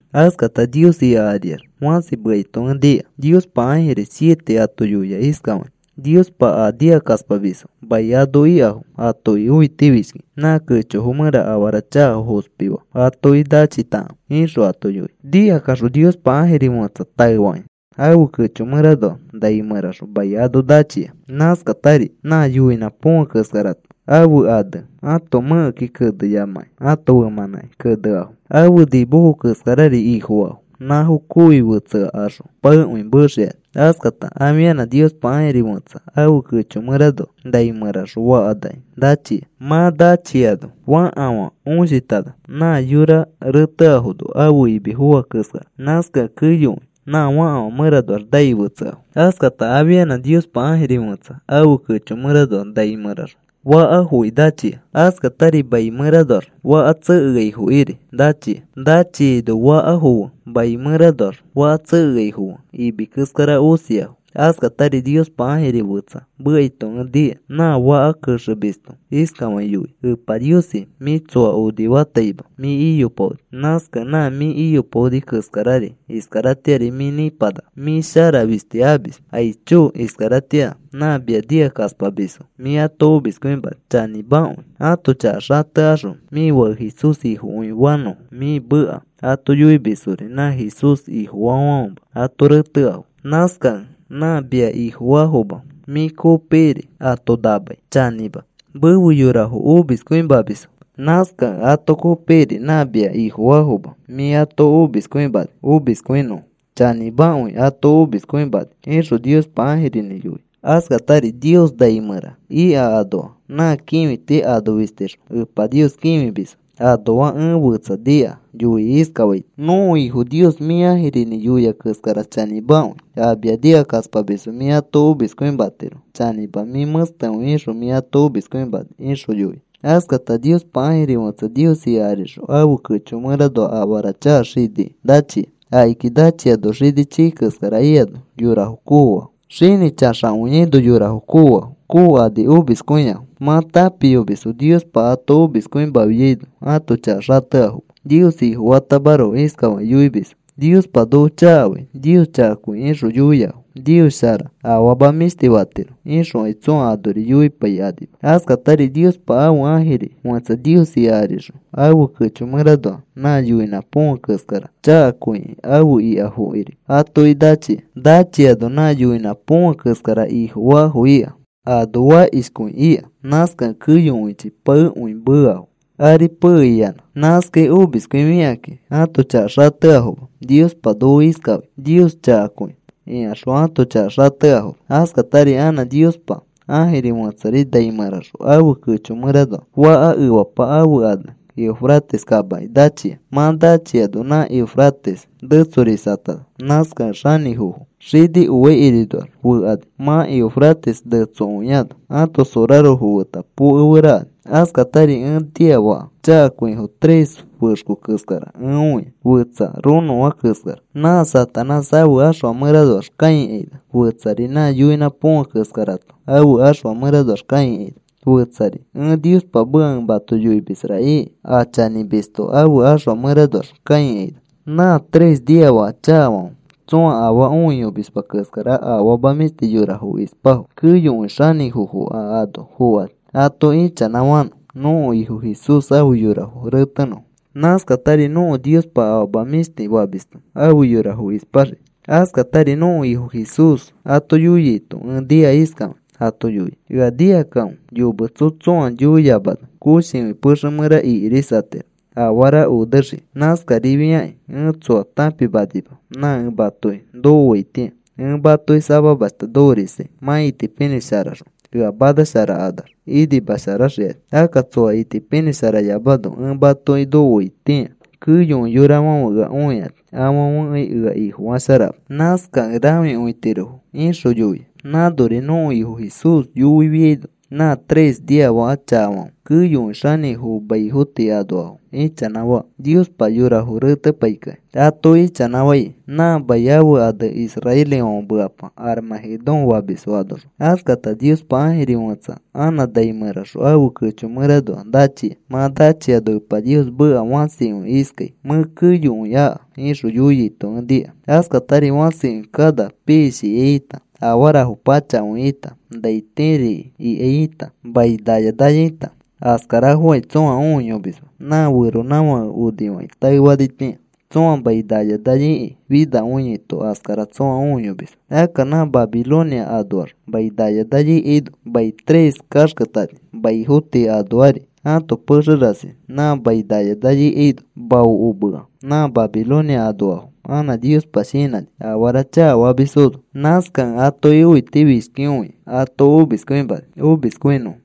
Askata Nios ika ariax fãsi mekaito ẽ nika. Niospa ãjirifo siete ato yoia iskafakĩ: “Niospa a nikakaspamisfo mai ano ikafo atoki õitifishkikĩ nã kechofo mẽra afara chakafo fospi faa atoki nachitakãfe,” ixõ ato yoia. Nikakaxõ Niospa ãjiri fẽtsa taefakĩ ãfe kecho mẽranoa nai mẽraxõ mai ano nachia. Nãskatari nã yoinã põfe keskarato ãfe ane ãto mẽkeki keneyamãkĩ ãto femãnãki keneafo, ãfe nimofo keskarari ifofaafo nãfo kooyoi fetsekaxõ paekõi meexikani. Askata afianã Niospa ãjiri fẽtsa ãfe kecho mẽranoa nai mẽraxõ fakafãnaki nachia. Mã nachiano fakafã õsinãtana nã yora reteafono ãfe imi foa keskara. Nãskakẽ keyokõi nã fakafã mẽranoax nai fetseafo. Askata afianã Niospa ãjiri fẽtsa ãfe kecho mẽranoa nai mẽraxõ fakafoki nachia, askatari mai mẽranoax faka tsekeaifokiri nachia. Nachiaino fakafo fe mai mẽranoax faka tsekeaifo fe imi keskara osiafo. Askatari Niospa ãfe ãjiri fetsa mekaito ẽ nika. Nã faka kexemisto iskafakĩ yoia: “Epa Niosi, mĩ tsoa onifataima mĩ iyopaoni. Nãskakẽ nã mĩ iyopaoni keskarari iskaratĩari mĩ nĩpanaka. Mĩ shara fisti amis. Aicho, iskaratĩa nã mia nikakaspamisfo mĩ ato omiskõimani chanĩmakõi. Ãto chaka xatekaxõ mĩ Fake Jesús Ifokõi fanõfo, mĩ meka ato yoimisfori nã Jesús Ifofaafãfema ato reteafo. Nãskakẽ nã mia Ifofaafoma mĩ kopikiri ato namai chanĩma. Mefe yorafo omiskõimamisfo. Nãskakẽ ato kopikiri nã mia Ifofaafoma mĩ ato omiskõimani omiskõinõfo. Chanĩmakõi ato omiskõimani,” ixõ Niospa ãjirinĩ yoia. Askatari Nios nai mẽra ika anoa nã kĩfiti ano fistixõ Epa Nios kĩfimisfo anoa ẽ fetsa nika yoikĩ iskafaito: “Nõko Ifo Nios, mĩ ãjirinĩ yoia keskara chanĩmakõi. A mia nikakaspamisfo mĩ ato omiskõimatiro. Chanĩma, mĩ mẽstekõi ixõ mĩ ato omiskõimani,” ixõ yoia. Askata Niospa ãjiri fẽtsa Nios ika arixõ ãfe kecho mẽranoa afara chaka xiniki nachia. Akiki nachiano xini chii keskara ikano yorafo koofafo. Xini xanakõiaino yorafo koofafo. Kookani omiskõiafo. Mã tãpiyomisfo Niospa ato omiskõimafiaino ãto chaka xateafoma. Nios Ifofatamaroko. Iskafakĩ yoimisfo: “Niospa noko chakafai. Nios chakakõi,” ixõ yoiafo. “Nios shara. Afama mĩshti fatiro,” ixõkai tsõa anori yoipaikanima. Askatari Niospa ãfe ãjiri fẽtsa Nios ika arixõ ãfe kecho mẽranoa nã yoinã põfe keskara chakakõikĩ afe ikafokiri atoki nachia. Nachiano nã yoinã põfe keskara ifofaafo ika ano fakishkõi ika. Nãskakẽ keyokõichi paekõi meafo, aripe iyanã. Nãskai omiskõifikakĩ ãto chaka xateafoma. “Niospa noko iskafai. Nios chakakõi,” ikaxõ ãto chaka xateafoma. Askatari anã Niospa ãjiri fẽtsari nai mẽraxõ ãfe kecho mẽranoa faka efapa ãfe ane Eufrates kamaki nachia. Mã nachiano nã Eufrates netsorisatana. Nãskakẽ xanĩfofo xini oaikirinoax fekani, mã Eufrates netsokõiano, ãto sorarofo feta pokeferakani. Askatari ẽ niafaka chakakõifo tres fexko keskara ẽ õia. Fetsa ronõfã keskara nã Satanás ãfe ãxfa mẽranoax kãikaina, fetsari nã yoinã põfe keskarato ãfe ãxfa mẽranoax kãikaina, fetsari: “Ẽ Niospa meka ẽ mato yoimisra,” iki, a chanĩmisto ãfe ãxfa mẽranoax kãikaina. Nã tres niafaka chakafãfe tsõa afaa õiyomisma keskara afama mĩshti yorafo ispafo. Keyokõi xanĩfofo a ano fokani ato ichanãfanõ nõko Ifo Jesús afe yorafo retenõfo. Nãskatari nõko Niospa afama mĩshti famisto afe yorafo ispaxii. Askatari nõko Ifo Jesús ato yoiaito ẽ nika iskafakĩ ato yoia: “Ea nikakãfe. Yometso tsõa yoiyamano koshikõi pexe mẽra ikirisatiro afara onexikĩ. Nãskarifakĩ ẽ tsoa tãpimanima nã ẽ matoki nokoaitĩa. Ẽ matoki samamashta nokorisai. Mã itipinĩsharakaxõ ea manasharakanax inimasharaxikani. Akka tsoa itipinĩsharayamano ẽ matoki nokoaitĩa keyokõi yorafãfe ea õikani afãfekai ea Ifofasharama. Nãskakẽ rãfikõitirofo,” ixõ yoia. Nãnori nõko Ifo Jesús yoifiano nã tres niafaka chakafãfe keyokõi xanĩfofo maifo tii anoafo ichanãfaa Niospa yorafo retepaikĩ. Ato ichanãfai nã mai ãfe ane israelifãfe mekapa Armagedón famisfo anoxõ. Askata Niospa ãjiri fẽtsa anã nai mẽraxõ ãfe kecho mẽranoa nachia. Mã nachiano Epa Nios meka fãsikõi iskai: “Mẽ keyokõi aka,” ixõ yoiaito ẽ nika. Askatari fãsikõi kana piishikai ita, afarafo pachakõifo ita, nai tiri iki ikai ita, mai naya naya ita, askarafokai tsõa õiyomisma. Nã feronãfake onifakĩ taefanitĩa tsõa mai naya naya iki finakõiaito askara tsõa õiyomisma. Akka nã Babilonia anoax mai naya naya ikaino mai tres kaxketani. Maifo tii anoari ãto pexe rasi nã mai naya naya ikaino maokomea. Nã Babilonia anoafo anã Niospa shinãni afara chakafamisfono. Nãskakẽ atoki õitifishkikõikĩ ato omiskõimani omiskõinõfo.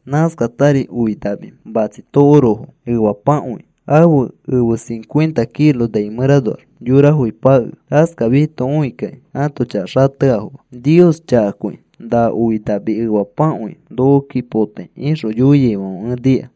Nãskatari oi nami matsi tokorofo efapakõi ãfe efe cincuenta kilo nai mẽranoax yorafoki pakea. Askafiaito õikakĩ ãto chaka xateafoma. “Nios chakakõi. Na oi nami efapakõi nokoki potai,” ixõ yoiaifãfe ẽ nika.